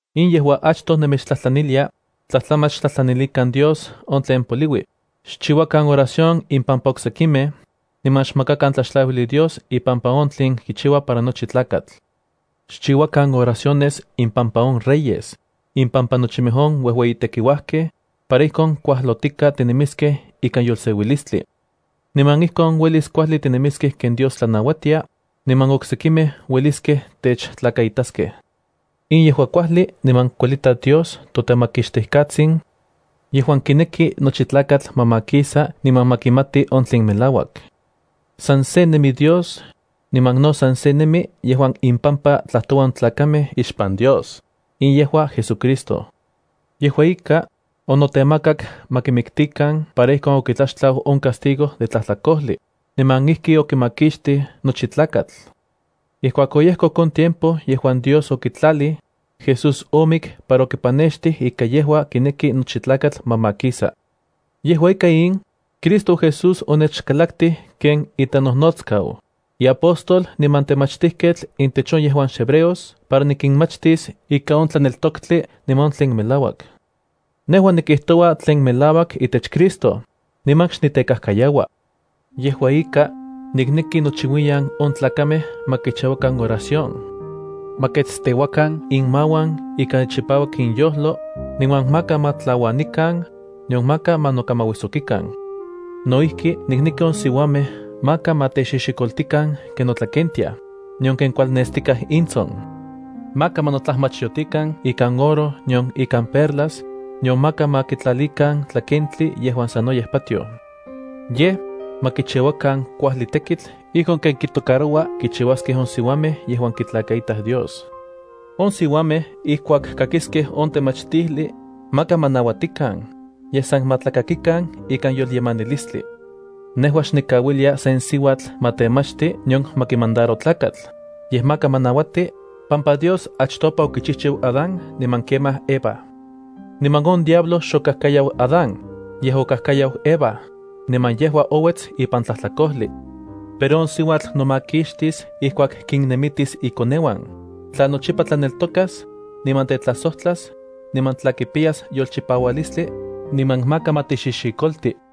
In yejua achtoj nemechtlajtlanilia, tlajtlamach xtlajtlanilikan Dios on tlen poliui, xchiuakan oración impampa oksekimej, niman xmakakan tlaxtlauijli Dios ipampa on tlin kichiua para nochi tlakatl. Xchiuakan oraciones impampa on reyes, impampa nochimej on uejueyitekiuajkej, para ijkon kuajlotika tinemiskej ikan yolseuilistli. Niman ijkon uelis kuajli tinemiskej ken Dios tlanauatia, niman oksekimej ueliskej techtlakaitaskej. In yejua kuajli niman kuelita Dios toTemakixtijkatsin, yejuan kineki nochi tlakatl ma makisa niman ma kimati on tlen melauak. San se nemi Dios, niman no san se nemi yejuan impampa tlajtoua on tlakamej ixpan Dios, in yejua JesuCristo. Yejua ika, onotemakak ma kimiktikan para ijkon okitlaxtlau on castigo de tlajtlakojli, niman ijki okimakixtij nochi tlakatl. Ijkuak oyejkok on tiempo yejuan Dios okitlalij, Jesús omik para okipanextij ika yejua kineki nochi tlakatl ma makisa. Yejua ika in, Cristo Jesús onechkalaktij ken itenojnotskau, iapóstol niman temachtijketl intech on yejuan xhebreos para nikinmachtis ika on tlaneltoktli niman on tlen melauak. Nejua nikijtoua tlen melauak itech Cristo, niman xnitekajkayaua. Yejua ika, nikneki nochiuiyan on tlakamej ma kichiuakan oración. Ma ketsteuakan inmauan ika chipauak inyojlo, niman maka ma tlauanikan, nion maka ma nokamauijsokikan. No ijki nikneki on siuamej maka ma texixikoltikan ken notlakentiaj, nion ken kualnextikaj intson. Maka ma notlajmachyotikan ikan oro nion ikan perlas, nion maka ma kitlalikan tlakentli yejuan sanoyej patioj. Yej, ma kichiuakan kuajli tekitl ijkon ken kitocaroua kichiuaskej on siuamej yejuan kitlakaitaj Dios. On siuamej ijkuak kakiskej on temachtijli, maka ma nauatikan, yej san ma tlakakikan ikan yolyemanilistli. Nejua xnikauilia sen siuatl ma temachti nion ma kimandaro tlakatl, yej maka ma nauati, pampa Dios achtopa okichijchiu Adán niman kemaj Eva. Niman on diablo xokajkayau Adán, yej okajkayau Eva, niman yejua ouets ipan tlajtlakojli. Pero on siuatl nomakixtis ijkuak kinnemitis ikoneuan, tla nochipa tlaneltokas, niman tetlajsojtlas, niman tla kipiyas yolchipaualistli, niman maka ma texixikolti.